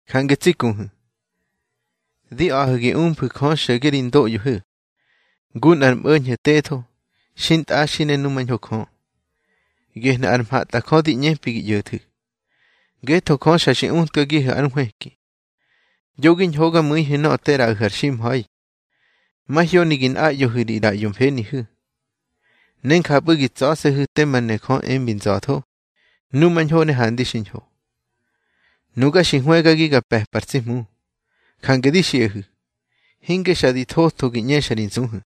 Jange tsi kuhu̱, di a̱ꞌahu̱ gi umfu̱ Jö xo̱ge ri ndoꞌyohu̱, ngu nꞌar mꞌo̱ñho̱ tetho, xintꞌaxi ne numañho Jö. Gehnu̱ ar mhatꞌajö di ꞌñepi gi ꞌyo̱thu̱, ngetho Jö xa xi utkagihu̱ ár nhwëki. Yo gi ñhogamu̱ihu̱ nöꞌö te ꞌraꞌahu̱ ar ximha̱i. Mahyoni gi nꞌaꞌyohu̱ ri ꞌraꞌyo mfenihu̱, ne njapꞌu̱ gi tsa̱se̱hu̱ tema ne Jö embi nza̱tho, numañho ne handi xiñho. Nuga xi hwëgagi ga pe̱pa ar tsi Hmu, jange di xiꞌahu̱, hinge xa di thotho gi ꞌñexa ri nsuhu̱.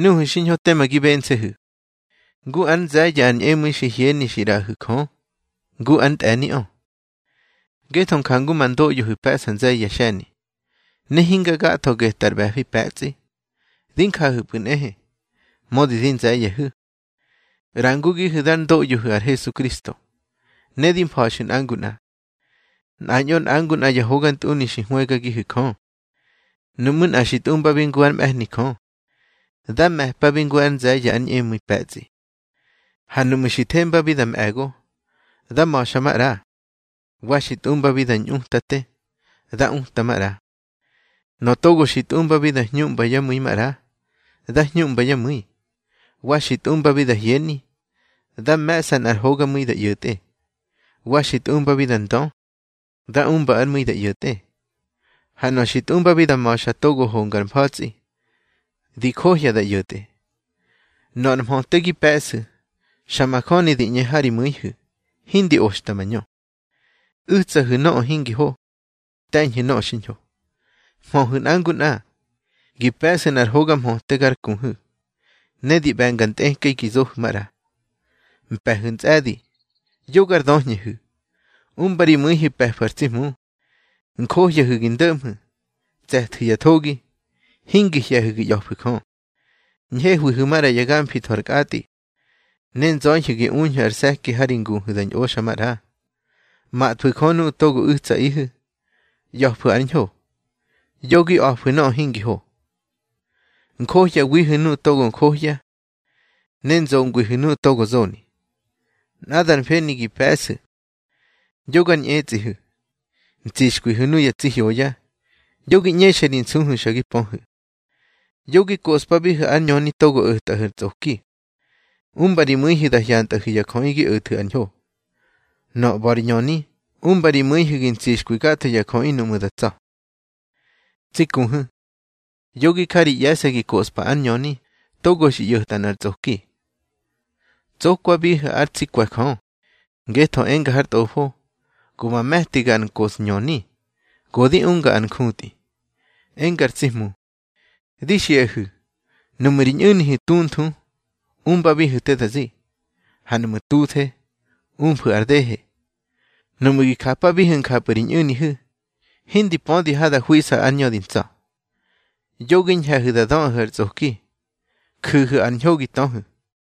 Nuhu̱ xiñho tema gi bense̱hu̱, ngu ár nze̱ye̱ ar ñꞌemu̱i xi hyeni xi ꞌraꞌahu̱ Jö, ngu ár ntꞌe̱niꞌö. Ngetho jangu ma ndoꞌyohu̱ pe̱ꞌsa nze̱ye̱ yá xe̱ni, ne hinga gatho getꞌar ꞌbe̱fi pe̱tsꞌi, di njahu̱pꞌu̱ nꞌehe. Mödi di nze̱ye̱hu̱, ꞌrangugihu̱ dár ndoꞌyohu̱ ar Hesukristo, ne di mfa̱xu̱ nꞌa ngu nꞌa. Nꞌañꞌo nꞌa ngu nꞌa ya hogantꞌuni xi hwëgagihu̱ Jö. Nuꞌmu̱ nꞌa xi tꞌumbabi ngu ár mꞌe̱hni Jö, dá me̱pabi ngu ár nze̱ye̱ ár ñꞌemu̱i pe̱tsꞌi. Ha nuꞌmu̱ xi thembabi da mꞌe̱go, dá ma̱xa maꞌra. Wa xi tꞌumbabi da ñꞌutate, dá uta maꞌra. Nöꞌö togo xi tꞌumbabi da hñuꞌmba yá mu̱i maꞌra, dá hñuꞌmba yá mu̱i. Wa xi tꞌumbabi da hyeni, dá me̱ꞌsa nꞌar hogamu̱i da ꞌyo̱tꞌe. Wa xi tꞌumbabi da ndö, dá umba ár mu̱i da ꞌyo̱tꞌe. Ha nöꞌö xi tꞌumbabi da ma̱xa togo honga ar mfa̱tsꞌi, di johya da ꞌyo̱tꞌe. Nöꞌö ar mhöte gi pe̱ꞌsu̱, xa majöni di ꞌñe ha ri mu̱ihu̱, hindi oxta mañö. U̱tsahu̱ nöꞌö hingi ho, te̱ñhu̱ nöꞌö xiñho. Mhöhu̱ nꞌa ngu nꞌa, gi pe̱ꞌsu̱ nꞌar hoga mhöte gar kuhu̱. Ne di ꞌbe̱nga ntꞌekꞌei gi zohu̱ maꞌra. Mpe̱hu̱ ntsꞌe̱di, yo gar döhñehu̱. Umba ri mu̱ihu̱ pe̱fu̱ ar tsi Hmu. Njohyahu̱ gi ndo̱ꞌmhu̱, tse̱thu̱ ya thogi, hingi hye̱hu̱ gi ꞌya̱fu̱ Jö. Ñhehwihu̱ maꞌra ya gamfi tho ar kꞌatꞌi, ne nzöihu̱ gi uñhu̱ ar se̱ki ha ri nguhu̱ da ñꞌoxa maꞌra. Mathwu̱ Jö nuꞌu̱ togo u̱tsaꞌihu̱. ꞌYa̱fu̱ ár ñho, yo gi a̱fu̱ nöꞌö hingi ho. Njohyawihu̱ nuꞌu̱ togo johya, ne nzongwihu̱ nuꞌu̱ togo zoni. Nꞌadar mfeni gi pe̱ꞌsu̱. Yo gar ñꞌetsꞌihu̱, ntsixkwihu̱ nuya tsi hyoya. Yo gi ꞌñexa ri nsuhu̱ xa gi pöhu̱. Yo gi koꞌspabihu̱ ár ñöni togo o̱tꞌahu̱ ar tsꞌoki. Umba ri mu̱ihu̱ da hyantꞌahu̱ ya jöꞌi gi o̱thu̱ ar ñho. Nöꞌö ꞌba̱ ri ñöni, umba ri mu̱ihu̱ gi ntsixkwi gatho ya jöꞌi nuꞌmu̱ da tsa̱. Tsi kuhu̱, yo gi ja ri ꞌye̱se̱ gi koꞌspa ár ñöni togo xi ꞌyo̱tꞌa nꞌar tsꞌoki. Tsokwabihu̱ ár tsi kwe̱ Jö, ngetho enga har Tꞌofo: Go ma me̱tiga ar nkoꞌsñöni, go di unga ar njutꞌi, enga ar tsi Hmu. Di xiꞌahu̱, nuꞌmu̱ ri ñꞌu̱nihu̱ tunthu, umbabihu̱ te da zi, ha nuꞌmu̱ tuthe, umfu̱ ar dehe. Nuꞌmu̱ gi japabihu̱ njapꞌu̱ ri ñꞌu̱nihu̱, hindi pödi ha da hwiꞌsa ár ñö di ntsa̱. Yo gi ñhe̱hu̱ da döꞌahu̱ ar tsꞌoki. Ju̱hu̱ ar ñho gi töhu̱.